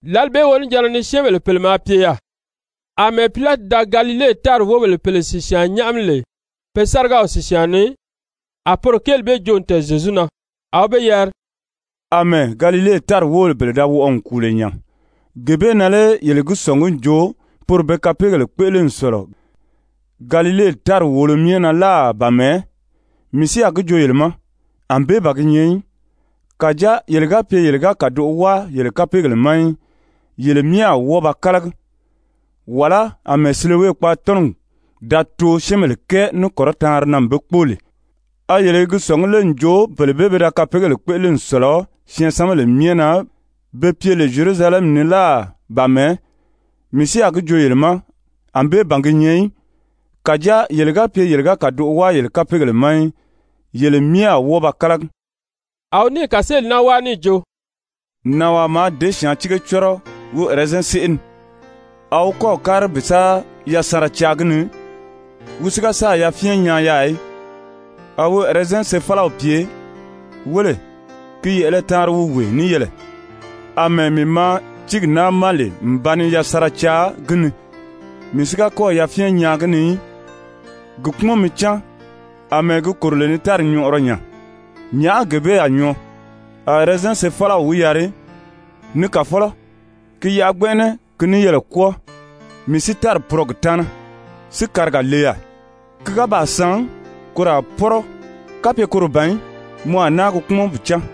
Lǎli bee wonijanna ni syɛ́ɛnbèle pèle maa pye yaà, àmɛɛ Pilati da Galile tári wóbèle pèle sìsyaan nyáʔami lè pe sárigaw sìsyaan ni, a poro kéeli bee joo n tɛ̀ɛn Zyezu na. A wi be yari: «Amɛɛ Galile tári wóbèle bee da wɔʔɔ n kùu lè nya, gee bee na lé yele gi sɔ̀ngí n jo poro be kapeegèle kpéʔele n sɔ̀lɔ Galile tári wòolo myɛ na láà ba mɛ̀ɛ́? Mii si a gi joo yele ma, ànbée ban gi nyɛ í. Kàjáa yele ga pye yele ga kàdoʔo wáa yele kapeegèle ma í, yele myɛ a wɔ́ɔ ba kálagi. Wàlá àmɛɛ Silowe Silowe: Silowe maa pye Zyerusalɛmi kèyabigaa. kpaatɔnɔgi da too syɛ́ɛnbèle kɛɛ ní kɔrɔtaanri na n be kpóo lè, a yele i gi sɔ̀ngí lé n jo bele bee pe da kapeegèle kpéʔele n sɔ̀lɔ syɛɛnsanbèle myɛ na be pye lè Zyerusalɛmi ni láà ba mɛ̀ɛ́? Mii si a gi joo yele ma ànbée ban gi nyɛ í. Kàjáa yele ga pye yele ga kàdoʔo wáa yele kapeegèle ma í, yele myɛ a wɔ́ɔ ba kálagi.» A wi níì kàseeli naa wáa níì jo: «Nànwaa maa děsyaantiige cɔ́rɔ wi ɛrɛzɛn séʔe ni. A wi kɔ́ɔ̀ kári bi sa yasanra caa gi ni. Wi si ga sáà yafyɛn nyaa yaà í. A wi ɛrɛzɛn sefalaw pye: ‹Wéle, ki yɛ̀ʔɛlɛ taanri wi wee níyɛɛlɛ, àmɛɛ mii maa tíigi naa ma lè n ba ni yasanra caa gi ni, mii si ga kɔ́ɔ̀ yafyɛn nyaa gi ni í. Gi kpúmɔn mi cáan. Amɛɛ gi kòro lè ni tári nyɔʔɔrɔ nya, nyàʔá gee bee a nyɔɔ?› A ɛrɛzɛn sefalaw wi yari: ‹Ni kàfɔlɔ, ki yaʔa gbɛnʔɛnɛ ki níyɛɛlɛ kwɔ́ɔ, mii si tári purɔ gi taana, si kariga le yaà. Ki ga baa san, koro a pɔ́rɔ. Kapye koro ban í, mɔ a náa gi kpúmɔn bi cáan.›»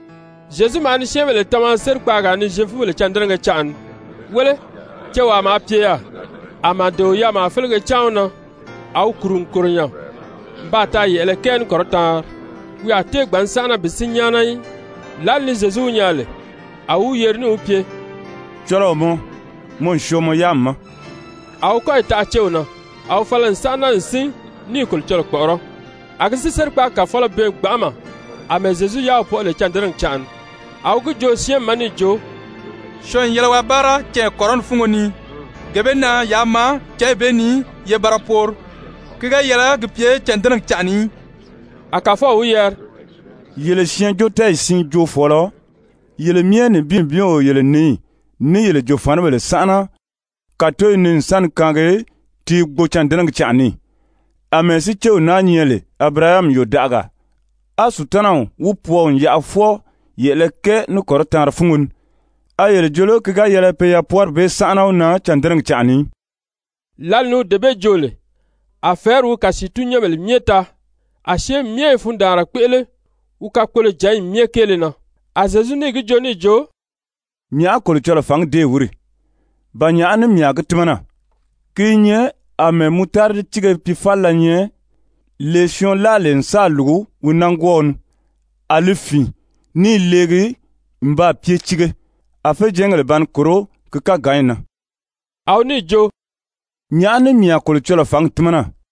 Zyezu maa ni syɛ́ɛnbèle tama sérikpaagaa ni Zyefubèle cândɛnɛgɛ canʔa ni. Wéle, cewaa maa pye yaà, a màdeo yaamaa félege cáan wi na, a wi kùru n kòro nya n baa taa yɛ̀ʔɛlɛ kɛɛ ní kɔrɔtaanri. Wi a tée gbǎn sánʔana bi sín nyáana í. Lǎli ni Zyezu wi nyaa lè, a wi wi yeri níì wi pye: «Cɔlɔɔ mɔ, mɔ n syɔɔ mɔ yáami ma.» A wi kɔ́yi taʔa céw na, a wi fala n sánʔana n sín ní i Kolocɔlɔɔ kpɔ̀ʔɔrɔ́. A gi si sérikpaagi kàfɔlɔ bɛɛn gbanʔama àmɛɛ Zyezu yáaw pɔʔɔ lè cândɛnɛgi canʔa ni, a wi gi joo syɛ́ɛnmi ma níì jo: «Syɔɔn n yɛlɛ waa báara canya kɔrɔni fúngo ni, gee bee na yaa maa cányi bee ni ye ba ra poori, ki ga yɛlɛ gi pye cândɛnɛgi canʔa ni í.» A Kàfɔw wi yari: «Yele syɛɛnjóotɛɛyi siin joofɔɔlɔ, yele myɛ nibin nibin o yele nǐyi, ní yele jòfanibèle sánʔana kàtoyi ni n sa ni kaangi ti i gbo cândɛnɛgi canʔa ni ì? Amɛɛ si céw naa nyɛ lè Abirahami yòdaʔagaa, á Sutanaw wi pwɔɔ n yaʔa fwɔɔ yɛ̀ʔɛlɛ kɛɛ ní kɔrɔtaanri fúngo ni, a yele jo lé ki ga yɛlɛ pe yapwɔɔri bee sánʔana wi na cândɛnɛgi canʔa ni í?» Lǎli ni wi dee bee joo lè, a fɛ̀ɛ́ri wi kasiitun-nyɛ́nbèle myɛ taa, a syɛ́ɛnmi myɛ i fundaanra kpéʔele wi kakpolojǎnyi myɛ kéele na. A Zyezu níì gi joo níì jo: «Nyàʔá Kolocɔlɔɔ fǎngi déè wíri? Ba nyàʔá ní mii a gi tímana? Ki i nyɛ àmɛɛ mutaridi tíige piifalila nyɛ, lee syɔɔn láa lè n sáà lùgu wi nángwɔɔw ni. A li fìin ní i leegi n baa pye tiige. A féjɛɛngèle ba ni kòró ki káganyi na.» A wi níì jo: «Nyàʔá ní mii a Kolocɔlɔɔ fǎngi tímana?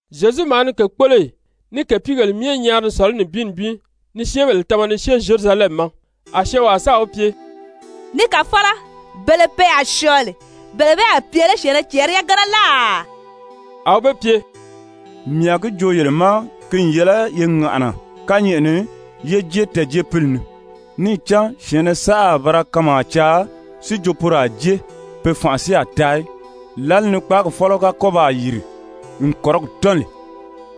Zyezu maa ni kèkpoloyi ní kèpiigèle myɛ nyaari ni sɔ̀lɔ́ nibin nibin ni syɛ́ɛnbèle tama ni syée Zyerusalɛmi ma. A syɔɔnwaa sáà wi pye: «Ni kàfɔlɔ, bele pe a syɔɔ lè, bele bee a pye lé syɛ̀ɛnnɛ cɛɛri yagana láà?» A wi be pye: «Mii a gi joo yele ma ki n yɛlɛ ye ŋàʔana kányɛʔɛ ni ye jée tɛɛ̀jeepili ni. Níì cán syɛ̀ɛnnɛ saʔa a ba ra kanmaa caa si jo poro a jée, pe fanʔa si a taa í. Lǎli ni kpáagi fɔ́lɔ ga kɔ́ baa yìri n kɔ̀rigi tɔ́n lè,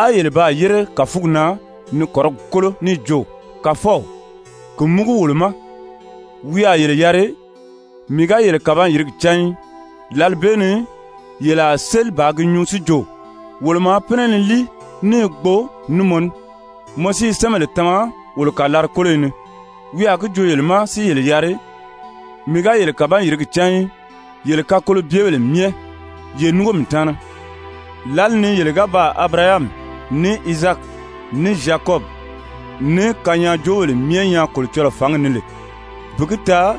á yele baa yére kàfugi na ni kɔ̀rigi kólo níì jo: ‹Kàfɔw! Ki múgu wolo ma!› Wi a yele yari: ‹Mii ga yele kàban-yìrigi cán í.› Lǎli bee ni yele a séli bàā gi nyuu si jo: ‹Wolo maa pínɛ ni líi ní i gbo ní mɔ ní, mɔ si i syɛ́ɛnbèle tama wolo kàlari-kóloyi ni.› Wi a gí joo yele ma si yele yari: ‹Mii ga yele kàban-yìrigi cán í. Yele kakolobyebèle myɛ, ye núngo mii taana.› Lǎli ni yele ga baa Abirahami, ní Izaaki, ní Zyakɔbi, ní kanyaajoobèle myɛ nyaa Kolocɔlɔɔ fǎngi ni lè, bi gi taa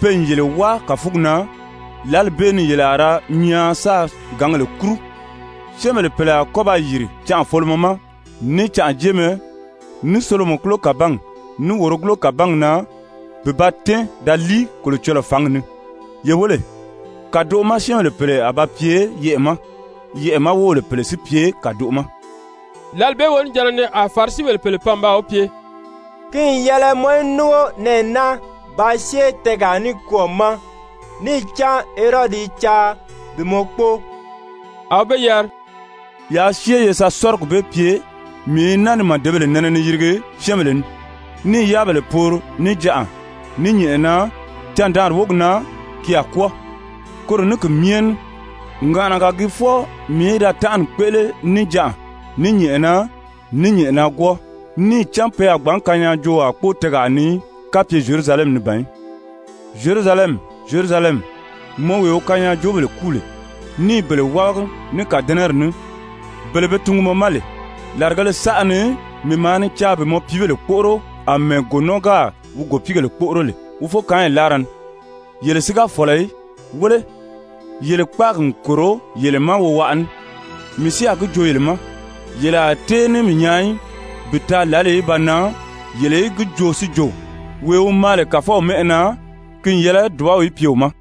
pe n yele wáa kàfugi na, lǎli bee ni yele a ra nyaan sáā gǎngèle kúru. Syɛ́ɛnbèle pèle a kɔ́ ba yìri canʔafolomɔ ma, ní canʔajeemɛ, ní solomɔkulo kàbangi, ní wòrogulo kàbangi na bi ba tɛ́ɛn da líi Kolocɔlɔɔ fǎngi ni. Ye wéle, kàdoʔo ma syɛ́ɛnbèle pèle a ba pye yɛʔɛ̀ ma, yɛʔɛ̀ ma wóbèle pèle si pye kàdoʔo ma.» Lǎli bee wonijanna ni a Farisibèle pèle pan n baa wi pye: «Ki n yɛlɛ mɔ í núngo nɛɛ naa bàā syée tɛɛgaa nikwɔɔ ma, níì cán Herodi i caa bi mɔ kpóo.» A wi be yari: «Yaa syée ye sa sɔ́rigi bee pye: ‹Mii i naa ni màdebèle nɛnɛ ni yirigi syɛ́ɛnbèle ni, ní i yáabèle poori níjanʔa, ní nyɛ̀ʔɛna, candaanri wógi na ki a kwɔ́ɔ.› Koro ní ki myɛ ní ŋàʔanaga gii fwɔɔ mii í da tánʔani kpéʔele níjanʔa, ní nyɛ̀ʔɛna, ní nyɛ̀ʔɛnagwɔɔ. Níì cán pe a gbǎn kanyaajoowaa kpóo tɛɛgaa ni í, kapye Zyerusalɛmi ni ban í. Zyerusalɛmi, Zyerusalɛmi, mɔ wee wi kanyaajoobèle kúu lè, ní i bele wábagi ní kàdɛnɛri ní, bele be tungu mɔ ma lè, làrigēle saʔa ni mii maa ni caa bi mɔ piibèle kpóʔoro àmɛɛ gònɔɔ gáà wi gòpiigèle kpóʔoro lè wi fókaanyi láara ni, yele si ga fɔ̀lɔ í. Wéle, yele kpáagi n kòro yele ma wowaʔa ní. Mii si a gi joo yele ma, yele a tée ní mii nyaa í, bi taa lǎli í ba nan yele í gi joo si jo: ‹Wee wi maa lè Kàfɔw mɛ́ʔɛ na, ki n yɛlɛ dùbaw í pye wi ma.›»